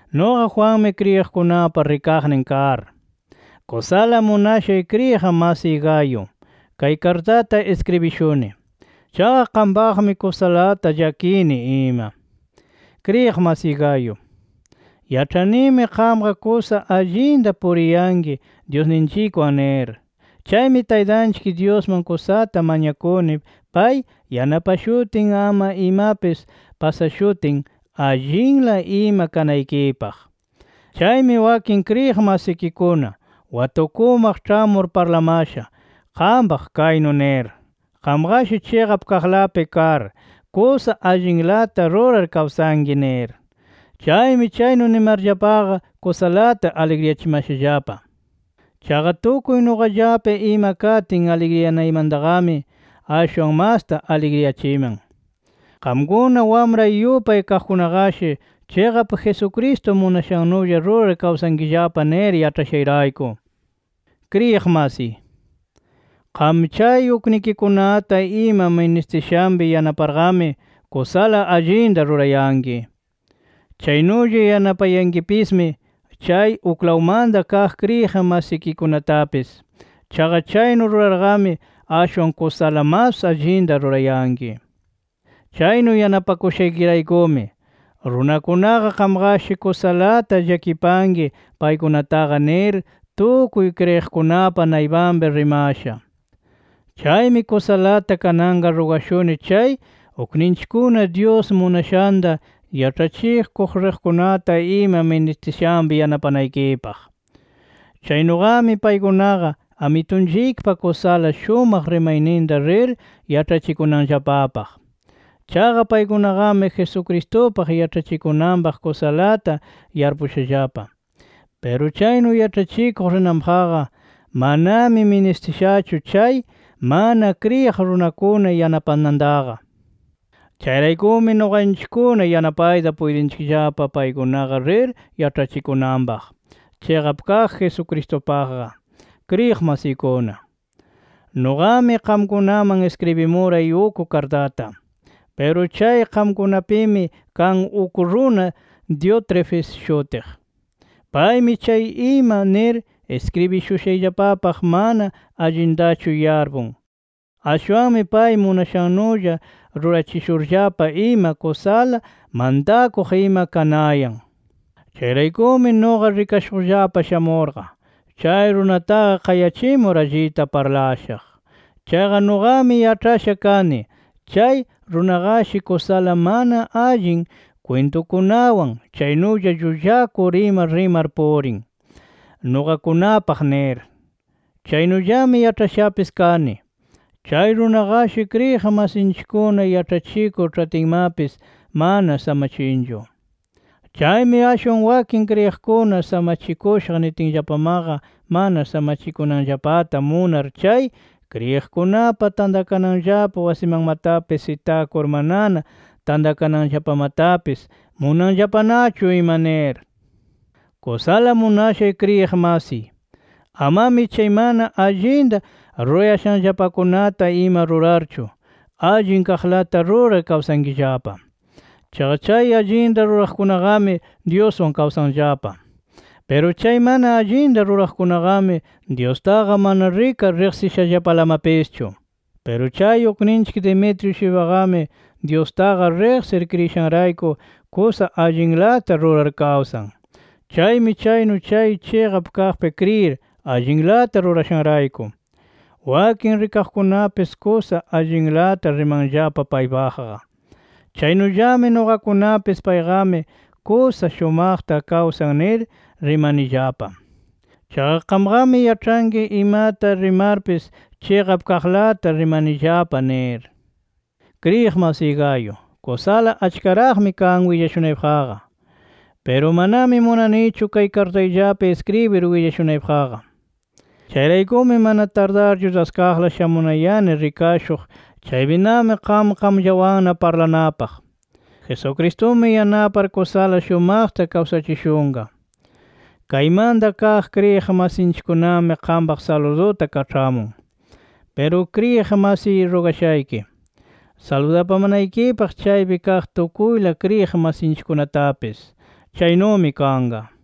Nuqa Juanmi kriyiqkunapa rikaqnin kar, kusala munashay kriyiq masiy Gayo, kay kartata iskribishuni. Chaqa qampaqmi kusalata llakini ima. Kriyiq masiy Gayo, yaĉhanimi qamqa kusa allinta puriyanki Dyusninchikwan nir. Chaymi Taytanchik Dyusman kusata mañakuni, pay yanapashutin ama imapis pasashutin, allinla ima kanaykipaq. Chaymi wakin kriyiq masikikuna watukumaq ĉhamur parlamasha qampaq, kaynu nir: Qamqashi chiqap kaqlapi kar, kusa allinlata rurar kawsanki nir. Chaymi chaynu nimarllapaqa, kusalata aligriyachimashallapa. Chaqa tukuy nuqallapi ima katin aligriyanaymantaqami, ashwan masta aligriyachiman, qamkuna wamray yupay kaqkunaqashi chiqap Jesucristo munashannulla rurar kawsankillapa nir yaĉhashayrayku. Kriyiq masiy, qam chay uknikikunata ima ministishanpi yanaparqami kusala allinta rurayanki. Chaynulla yanapayankipismi, chay uklawmanta kaq kriyiq masikikunatapis. Chaqa chaynu rurarqami ashwan kusala mas allinta rurayanki. Chaynu yanapakushaykiraykumi, runakunaqa qamqashi kusalata llakipanki paykunataqa nir, tukuy kriyiqkunapa naypanpi rimasha. Chaymi kusalata kananqa rugashuni chay ukninchikkuna Dyus munashanta yaĉhachikuq riqkunata ima ministishanpi yanapanaykipaq. Chaynuqami paykunaqa, Amitunchikpa kusala shumaq rimayninta rir yaĉhachikunanllapapaq. Chaqa paykunaqami Jesucristupaq yaĉhachikunanpaq kusalata yarpushallapa. Piru chaynu yaĉhachikuq rinanpaqqa manami ministishachu chay mana kriyiq runakuna yanapanantaqa. Chayraykumi nuqanchikkuna yanapayta puytinchikllapa paykunaqa rir yaĉhachikunanpaq, chiqap kaq Jesucristupaqqa. Kriyiq masiykuna, nuqami qamkunaman iskribimuray uk kartata. Piru chay qamkunapimi kan uk runa Diótrefes shutiq. Paymi chay ima nir iskribishushayllapapaq mana allintachu yarpun. Ashwanmi pay munashannulla rurachishurllapa ima, kusala mantakuq ima kanayan. Chayraykumi nuqa rikashuqllapa shamurqa, chay runataqa qayachimur allita parlashaq. Chaqa nuqami yaĉhasha kani, chay runaqashi kusala mana allin kwintunkunawan, chaynulla llullakur ima rimar purin, nuqakunapaq nir. Chaynullami yaĉhashapis kani, chay runaqashi kriyiq masinchikkuna yaĉhachikur ĉhatinmapis mana samachinchu. Chaymi ashwan wakin kriyiqkuna samachikushaq nitinllapamaqa mana samachikunanllapata munar chay kriyiqkunapa tantakananllapa wasimanmatapis itakur manana tantakananllapamatapis munanllapanachu ima nir. Kusala munashay kriyiq masiy, amami chay mana allinta rurayashanllapakunata ima rurarchu, allin kaqlata rurar kawsankillapa. Chaqa chay allinta ruraqkunaqami Dyuswan kawsanllapa. Piru chay mana allinta ruraqkunaqami, Dyustaqa mana rikar riqsishallapalamapischu. Piru chay ukninchik Demetrio-shuypaqami Dyustaqa riqsir kriyishanrayku, kusa allinlata rurar kawsan. Chaymi chaynu chay chiqap kaqpi kriyir allinlata rurashanrayku, wakin rikaqkunapis kusa allinlata rimanllapa paypaqqa. Chaynullami nuqakunapis, payqami kusa shumaqta kawsan nir rimanillapa. Chaqa qamqami yaĉhanki imata rimarpis chiqap kaqlata rimanillapa nir. Kriyiq masiy Gayo, kusala achkaraqmi kan willashunaypaqqa. Piru manami munanichu kay kartayllapi iskribir willashunaypaqqa. Chayraykumi mana tardarchu daskaqla shamunayani rikashuq, chaypinami qam qamllawanna parlanapaq. Jesucristumi yanapar kusala shumaqta kawsachishunqa. Kaymanta kaq kriyiq masinchikkunami qampaq saluduta kaĉhamun. Piru kriyiq masiy rugashayki, saludapamanaykipaq chaypi kaq tukuyla kriyiq masinchikkunatapis. Chaynumi kanqa.